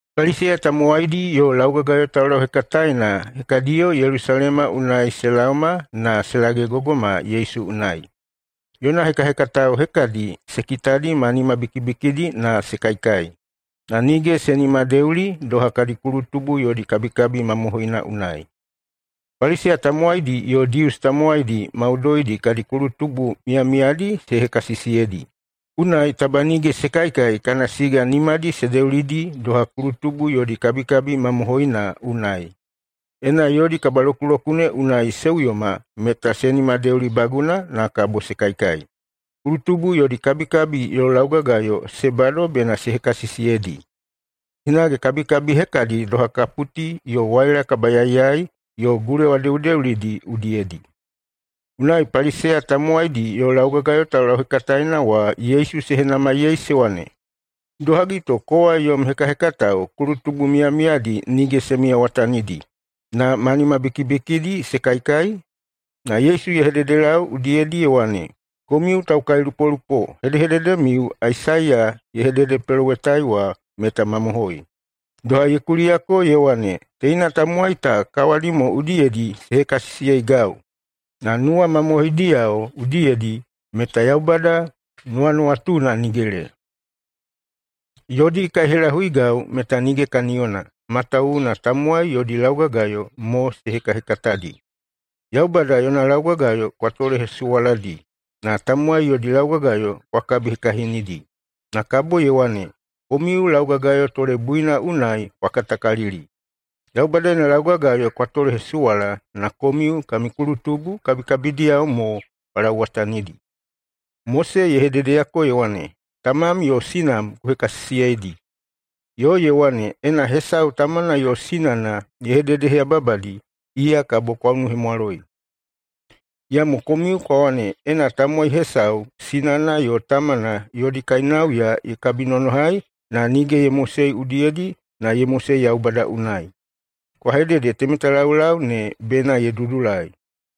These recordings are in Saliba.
Paliseya tamowaidi yo laugagayo taulauhekataena hekadiyo Yelusalema unai se laoma na se lagegogoma Yesu unai. Yona hekahekatao hekadi se kitadi ma nimabikibikidi na se kaikai, na nige se nimadeuli [doha kadi kulutubu yodi kabikabi mamohoina unai.] Paliseya tamowaidi yo Dius tamowaidi maudoidi kadi kulutubu miyamiyadi se hekasisiyeidi, unai taba nige se kaikai kana siga nimadi se deulidi doha kulutubu yodi kabikabi mamohoina unai. Ena yodi kabalokulokune unai se uyoma meta se nimadeulibaguna na kabo se kaikai. Kulutubu yodi kabikabi yo laugagayo se bado bena se hekasisiyeidi. Hinage kabikabi hekadi doha kaputi yo waila kabayaiyai yo gulewa deudeulidi udiyedi. Unai Paliseya tamowaidi yo laugagayo taulauhekataena wa Yesu se henamaiyei se wane, “Idohagi to kowa yom hekahekatao kulutubu miyamiyadi nige se miyawatanidi, na ma nimabikibikidi se kaikai?” Na Yesu ye hededelau udiyedi ye wane, “Komiu taukailupolupo hedehededemiu Aisaiya ye hededepelowetai wa meta mamohoi, doha ye kuliyako ye wane, ‘Teina tamowai ta kawadi mo udiyedi se hekasisiyeigau, na nuwamamohoidiyao udiyedi meta Yaubada nuwanuwatuna nigele. Yodi kaihelahuigau meta nige kaniyona, matawuwuna tamowai yodi laugagayo mo se hekahekatadi.’ Yaubada yona laugagayo kwa tolehesuwaladi, na tamowai yodi laugagayo kwa kabihekahinidi.” Na kabo ye wane, “Komiu laugagayo tolebuina unai kwa katakalili! Yaubada yona laugagayo kwa tolehesuwala na komiu kami kulutubu kabikabidiyao mo kwa lauwatanidi. Mose ye hededeyako ye wane, ‘Tamam yo sinam ku hekasisiyeidi.’ Yo ye wane, ‘Ena hesau tamana yo sinana ye hededeheyababadi, iya kabo kwa unuhemwaloi.’ Iyamo komiu kwa wane, Ena tamowai hesau sinana yo tamana yodi kainauya ye kabinonohai na nige ye mosei udiyedi na ye mosei Yaubada unai, kwa hedede temeta laulau ne bena ye dudulai.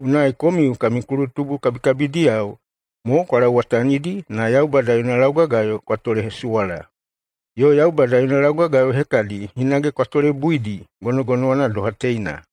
Unai komiu kami kulutubu kabikabidiyao mo kwa lauwatanidi na Yaubada yona laugagayo kwa tolehesuwala. Yo Yaubada yona laugagayo hekadi hinage kwa tolebuidi gonogonowana doha teina.”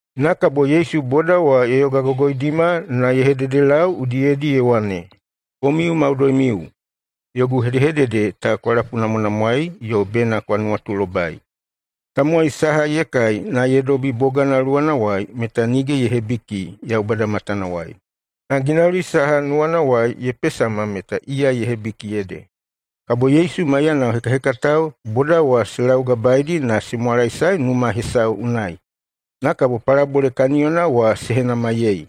Na kabo Yesu boda wa ye yogagogoidima na ye hededelau udiyedi ye wane, “Komiu maudoimiu, yogu hedehedede ta kwa lapunamwanamwaei yo bena kwa nuwatulobai. Tamowai saha ye kai na ye dobi bogana luwanawai meta nige ye hebiki Yaubada matanawai. Na ginauli saha nuwanawai ye pesama meta iya ye hebiki ede.” Kabo Yesu maiyana hekahekatao boda wa se laugabaeidi na se mwalaesae numa hesau unai, na kabo palabole kaniyona wa se henamaiyei.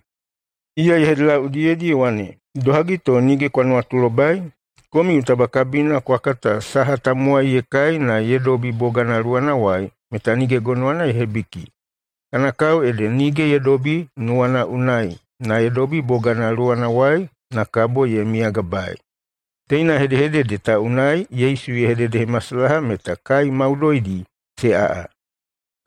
Iya ye hededelau udiyedi ye wane, “Idohagi to nige kwa nuwatulobai? Komiu taba kabina kwa kata saha tamowai ye kai na ye dobi bogana luwanawai meta nige gonowana ye hebiki. Kana kao ede nige ye dobi nuwana unai, na ye dobi bogana luwanawai, na kabo ye miyagabaei.” Teina hedehedede ta unai Yesu ye hededehemasalaha meta kai maudoidi se aꞌa.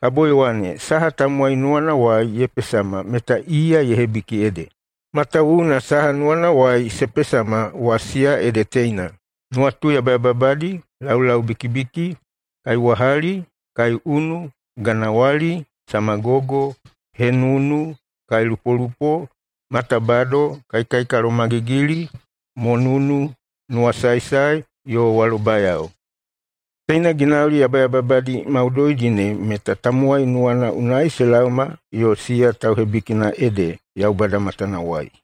Kabo ye wane, “Saha tamowai nuwanawai ye pesama meta iya ye hebiki ede, matawuwuna saha nuwanawai se pesama wa, siya ede teina: nuwatu yabayababadi, laulaubikibiki, kaiwahali, kaiunu, ganawali, samagogo, henunu, kailupolupo, matabado, kaikalomagigili, monunu, nuwasaesae, yo walobayao. Teina ginauli yabayababadi maudoidi ne meta tamowai nuwana unai se laoma yo siya tauhebikina ede [Yaubada matanawai].”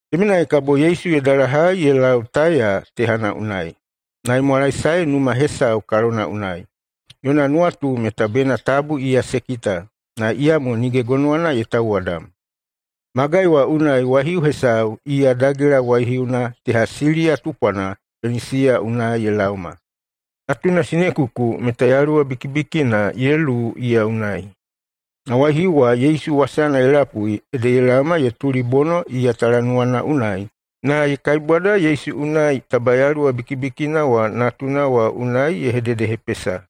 Temenai kabo Yesu ye dalahai ye lau Taiya tehana unai. Na ye mwalaesae numa hesau kalona unai. Yona nuwatu meta bena tabu iya se kita. Na iyamo nige gonowana ye tauwadam. Magai wa unai waihiu hesau, iya dagela waihiuna teha Siliya tupwana Penisiya unai ye laoma. Natuna sinekuku meta yaluwa bikibikina ye luwu iya unai. Na waihiu wa Yesu wasana ye lapui ede ye laoma ye tulibono iya talanuwana unai na ye kaibwada Yesu unai taba yaluwa bikibikina wa natuna wa unai ne ye hededehepesa.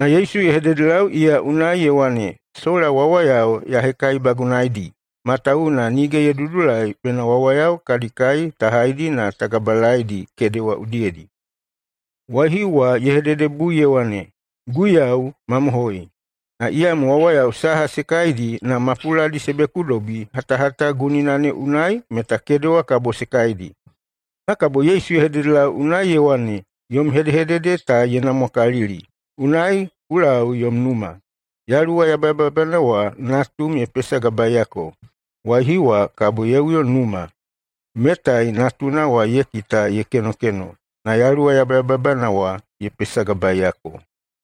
Na Yesu ye hededelau iya unai ye wane, “Sola wawayao ya hekaibagunaedi, matawuwuna nige ye dudulai bena wawayao kadi kai ta haidi na ta gabalaedi kedewa udiyedi.” Waihiu wa ye hededebui ye wane, “Guiyau, mamohoi! Na iyamo wawayao saha se kaidi na mapuladi se bekudobi hatahata gunina ne unai meta kedewa kabo se kaidi.” Na kabo Yesu ye hededelau unai ye wane, “Yom hedehedede ta ye namwakalili. Unai ku lau yom numa. Yaluwa yabayababana wa natum ye pesagabaeyako.” Waihiu wa kabo ye uyo numa. Metai natuna wa ye kita ye kenokeno, na yaluwa yabayababana wa ye pesagabaeyako.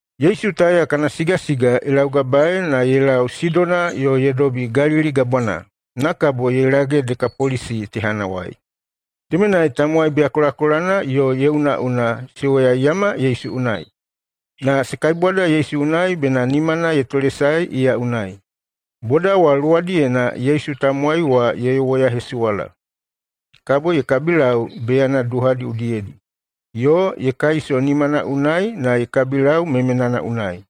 Yesu Taiya kana sigasiga ye laugabaei na ye lau Sidona yo ye dobi Galili Gabwana, na kabo ye lage Dekapolisi tehanawai. Temenai tamowai beyakolakolana yo ye unaꞌuna se woyaiyama Yesu unai. Na se kaibwada Yesu unai bena nimana ye tolesae iya unai. Boda wa luwadiyena Yesu tamowai wa ye woyahesuwala. Kabo ye kabilau beyana duhadi udiyedi, yo ye kaiso nimana unai na ye kabilau memenana unai.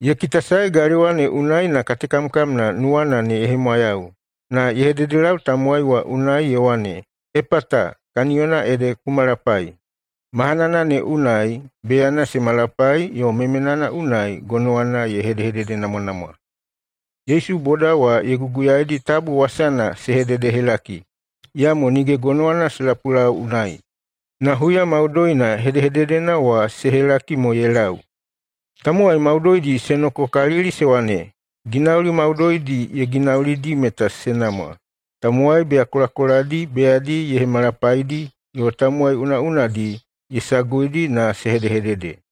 Ye kitasae galewa ne unai na katekamkamna nuwana ne ye hemwayau, na ye hededelau tamowai wa unai ye wane, “Epata!”, kaniyona ede, “Ku malapai!” Mahanana ne unai beyana se malapai yo memenana unai gonowana ye hedehededenamwanamwa. Yesu boda wa ye guguyaidi tabu wasana se hededehelaki. Iyamo nige gonowana se lapulau unai, na huya maudoina hedehededena wa se helaki mo ye lau. Tamowai maudoidi se nokokalili se wane, “Ginauli maudoidi ye ginaulidi meta se namwa. Tamowai beyakolakoladi beyadi ye hemalapaidi, yo tamowai unaꞌunadi ye saguidi na se hedehedede.”